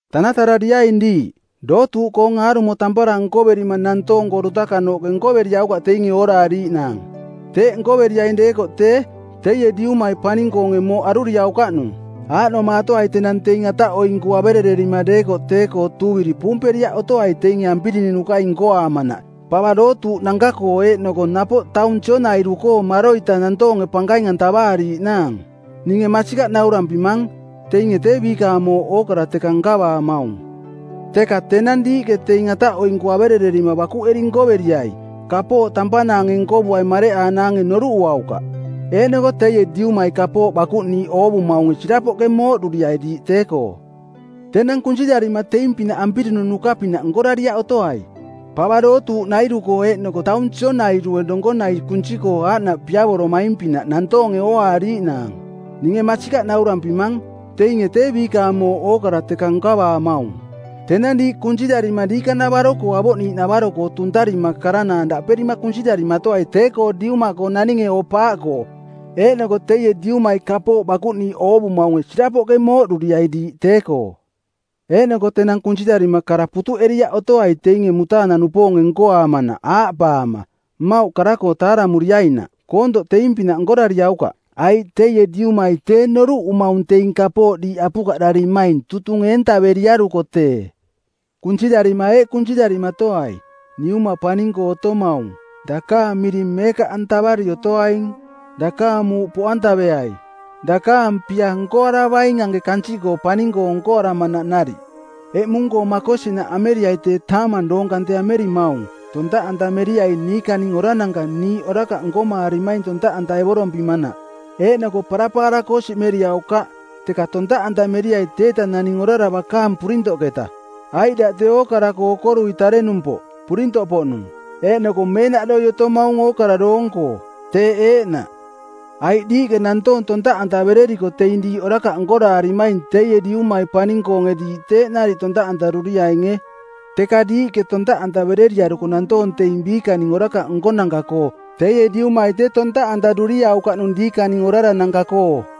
“Tanatarariaing diiꞌ. Dootuuꞌkoong aarumo tampara nkoverima nantoong-koo dutakanooꞌke nkoveriaukaꞌ teinge ooraariiꞌnaang. Teeꞌ nkoveriaing deekoꞌ tee, teie Diumai paning-koonge mooꞌ aruriaukaꞌnung. Aaꞌnomaatoai tenang teing ataꞌoinku averererima deekoꞌ tee-koo tuuviri puumperiaꞌ otoai teinge ampirinunukai nkoaamanaꞌ pava dootuuꞌnanka-koo eeꞌnoko napoꞌ taung sionairu-koo maroita nantoonge pankaing-antavaariiꞌnaang. Ninge masikaꞌ naurampimang, teinge tee biikaang mooꞌ ookara teka nkavaamaung. Teka tenang diiꞌke teing ataꞌoinku averererima bakuꞌeri nkoveriai kapooꞌ tampanaange nkovuaing mareꞌanaange noruꞌuaukaꞌ; Eeꞌnoko teie Diumai kapooꞌ bakuꞌniiꞌ oovumaunge sirapoꞌke mooꞌduriai diiꞌ tee-koo.” “Tenang kunsirarima teing-pinaꞌ ampirinunuka-pinaꞌ nkorariaꞌ otoai. Pava dootuuꞌnairu-koo eeꞌnoko taung sionairue donkonai kunsi-koo aaꞌnaꞌ piavoromaing-pinaꞌ nantoonge ooaariiꞌnaang. Ninge masikaꞌ naurampimang, teinge tee biikaang mooꞌ ookara teka nkavaamaung. Tenang diiꞌ kunsirarima diikanavaro-koo avoꞌniiꞌnavaro-koo tuntarima karanaang daꞌperima kunsirarimatoai tee-koo Diuma-koo naninge oo-paaꞌkoo, eeꞌnoko teie Diumai kapooꞌ bakuꞌniiꞌ oovumaunge sirapoꞌke mooꞌduriai diiꞌ tee-koo. Eeꞌnoko tenang kunsirarima kara putuꞌeriaꞌ otoai teinge mutaanang-koo-nupoonge nkoaamanaꞌ aaꞌpaama, ‘Mmauꞌ kara-koo taaramuriainaꞌ.’ Koontoꞌ teing-pinaꞌ nkorariaukaꞌ, aiꞌ teie Diumai tee noruꞌumaung teing kapooꞌ diiꞌ apukaꞌdarimaing tutung eentaveriaruko tee. “Kunsirarima eeꞌ kunsirarimatoai, ‘Niuma paning-koo otomaung, dakaang miring meekaꞌantavari otoaing. Dakaang muuꞌ poꞌantaveai. Dakaang pia nkoaravaing anke kansiꞌkoo paning-koo nkoaramanaꞌ nariꞌ. Eꞌmung-koo makosinaꞌ ameriai tee taamang doong kante amerimaung. Tontaꞌantameriai niikaning orarananka niiꞌ orakaꞌ nkomaarimaing tontaꞌantaevorompimanaꞌ. Eeꞌnoko parapaara-koo siꞌmeriaukaꞌ, teka tontaꞌantameriai teieta naning orara bakaang purintoꞌketa; aiꞌ daꞌ tee ookara-koo okorui tarenumpoꞌ, purintoꞌpoꞌnung, eeꞌnoko meenaꞌdoi otomaung ookara doong-koo. Teeꞌ eeꞌnaꞌ.’ “Aiꞌ diiꞌke nantoong tontaꞌantavereriko teing diiꞌ orakaꞌ nkoraarimaing teie Diumai paning-koonge diiꞌ teeꞌ nariꞌ tontaꞌantaruriainge. Teka diiꞌke tontaꞌantavereriaruko nantoong teing biikaning orakaꞌ nkonanka-koo teie Diumai tee tontaꞌantaruriaukaꞌnung diikaning orarananka-koo.”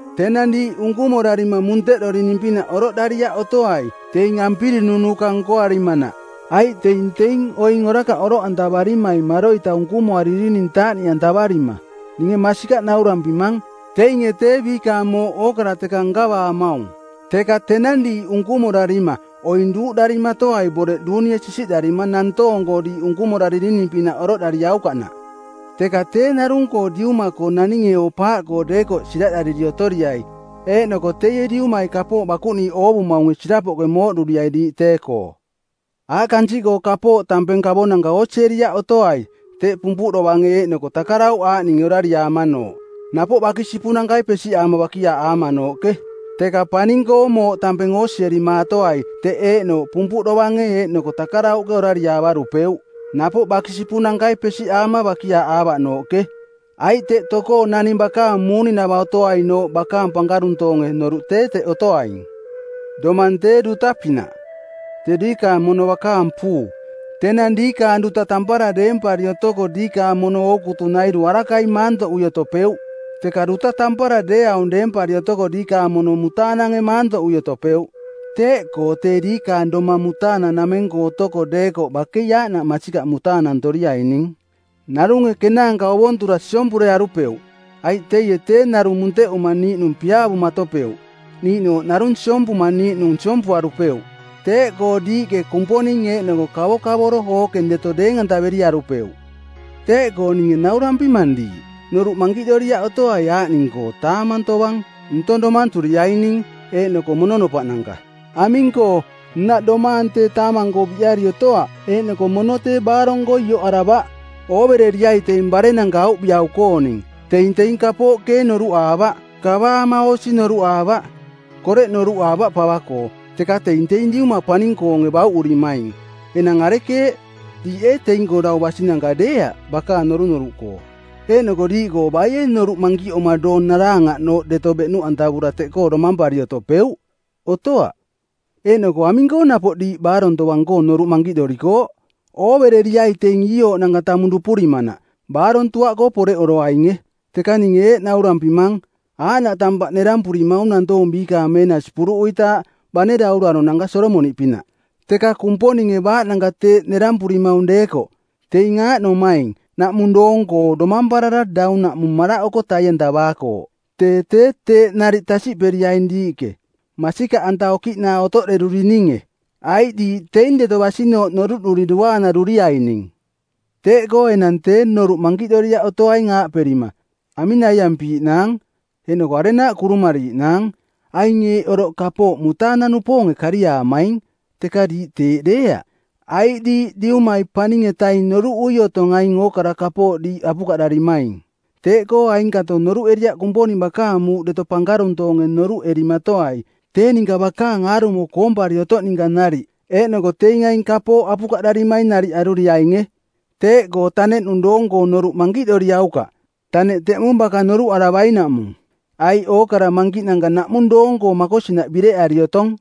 “Tenang diiꞌ unkumorarima munteꞌdorining-pinaꞌ oroꞌdariaꞌ otoai teing ampirinunuka nkoarimanaꞌ, aiꞌ teing teing oing orakaꞌ oroꞌantavarimaing maroita unkumoaririning taaꞌniꞌantavarima. Ninge masikaꞌ naurampimang, teinge tee biikaang mooꞌ ookara teka nkavaamaung. Teka tenang diiꞌ unkumorarima oing duuꞌdarimatoai boreꞌ duunie sisiꞌdarima nantoong-koo diiꞌ unkumoraririning-pinaꞌ oroꞌdariaukaꞌnaꞌ; Teka tee narung-koo Diuma-koo naninge oo-paaꞌkoo deekoꞌ siraꞌdariri otoriai eeꞌnoko teie Diumai kapooꞌ bakuꞌniiꞌ oovumaunge sirapoꞌke mooꞌduriai diiꞌ tee-koo.” “Aꞌ kansiꞌkoo kapooꞌ tampeng kavonanka oosieriaꞌ otoai teꞌ pumpuꞌ dovange eeꞌnoko takarauꞌ aaꞌninge orariaamanooꞌ, napoꞌ bakisipunankai pesiꞌaama bakiaaꞌaamanooꞌke. Teka paning-koo mooꞌ tampeng oosierimaatoai teꞌ eeꞌnooꞌ pumpuꞌ dovange eeꞌnoko takarauꞌke orariaavarupeuꞌ, napoꞌ bakisipunankai pesiꞌaama bakiaaꞌaavaꞌnooꞌke. Aiꞌ teꞌ tokoo naning bakaang muuninava˜ otoainooꞌ bakaang pankaruntoonge noruꞌ tee teꞌ otoaing. “Domang tee duta pinaꞌ, tee diikaang mono bakaang puu. Tenang diikaang duta tampara deempari otoko diikaang mono ootukunairu arakai maantoꞌui otopeuꞌ. Teka duta tampara deeaung deempari otoko diikaang mono mutaanange maantoꞌui otopeuꞌ. Teeꞌkoo tee diikaang domang mutaanang-nameng-koo otoko deekoꞌ bakei aaꞌnaꞌ masikaꞌ mutaanantoriaining. Narunge kenaanka ovontura siompurearupeuꞌ, aiꞌ teie tee narung munteꞌuma niiꞌnung piaavumatopeuꞌ, niiꞌnooꞌ narung siompuma niiꞌnung siompuarupeuꞌ. Teeꞌkoo diiꞌke Kumponing eeꞌnoko kavokavoro ookeng deto deeng-antaveriarupeuꞌ. “Teeꞌkoo ninge naurampimang diiꞌ, noruꞌ mankiꞌdoriaꞌ otoai aaꞌning-koo taamang tovang ntong domanturiaining eeꞌnoko mononopaꞌnanka. Aming-koo, nnaꞌ, domaang tee taamang-koo biꞌari otoaꞌ eeꞌnoko mono tee baarong-koo ioꞌaravaꞌ. Oovereriai teing barennanka auviꞌau-kooning. Teing teing kapooꞌ keeng noruꞌaavaꞌ, kavaama oosi noruꞌaavaꞌ, koreꞌ noruꞌaavaꞌ pava-koo, teka teing teing Diumai paning-koonge bauꞌurimaing. Enang arekeeꞌ, diiꞌ ee teing-koo dau basinanka deeaꞌ bakaang norunoruꞌkoo? Eeꞌnoko diiꞌkoo baie noruꞌ mankiꞌoma doong naraangaꞌnooꞌ deto beꞌnuꞌantavura teꞌkoo domampari otopeuꞌ? Otoaꞌ. Eeꞌnoko aming-koo napoꞌ diiꞌ baarong tovang-koo noruꞌ mankiꞌdorikooꞌ? Oovereriai teing iiooꞌnanka tamung dupurimanaꞌ, baarong tuaꞌkoo poreꞌoroainge. Teka ninge eeꞌ naurampimang, aaꞌnaꞌ tampaꞌ nerampurimaung nantoong biikaang meenasi puruꞌuitaaꞌ, bane dauraronanka Solomoniꞌpinaꞌ. Teka Kumponinge baaꞌnanka teeꞌ nerampurimaung deekoꞌ, teing aaꞌnomaing naꞌmung doong-koo domamparara daunaꞌmung maraꞌoko tai-antavaakooꞌ, tee tee teeꞌ nariꞌ tasiꞌperiaing diiꞌke, masikaꞌanta okiꞌnaa otoꞌderurininge, aiꞌ diiꞌ teing deto basinooꞌ noruꞌduri duaanaruriaining. Teeꞌkoo enang tee noruꞌ mankiꞌdoriaꞌ otoaing aaꞌperima, ‘Aming naiampiiꞌnaang?’ eeꞌnoko ‘Arenaaꞌ kurumariiꞌnaang?’ Aing eeꞌ oroꞌ kapooꞌ mutaanang-nupoonge kariaamaing, teka diiꞌ teeꞌ deeaꞌ, aiꞌ diiꞌ Diumai Paning-etaing noruꞌui otong aing ookara kapooꞌ diiꞌ apukaꞌdarimaing. Teeꞌkoo ainkato noruꞌeriaꞌ Kumponing bakaang muuꞌ deto pankaruntoonge noruꞌerimatoai tee ninka bakaang aarumo koompari otoꞌ ninka nariꞌ eeꞌnoko teing aing kapooꞌ apukaꞌdarimaing nariꞌ aruriainge. Teeꞌkoo taneꞌnung doong-koo noruꞌ mankiꞌdoriaukaꞌ. Taneꞌ teꞌmung baka noruꞌaravainaꞌmung. Aiꞌ ookara mankiꞌnanka naꞌmung doong-koo makosinaꞌ bireꞌari otong.”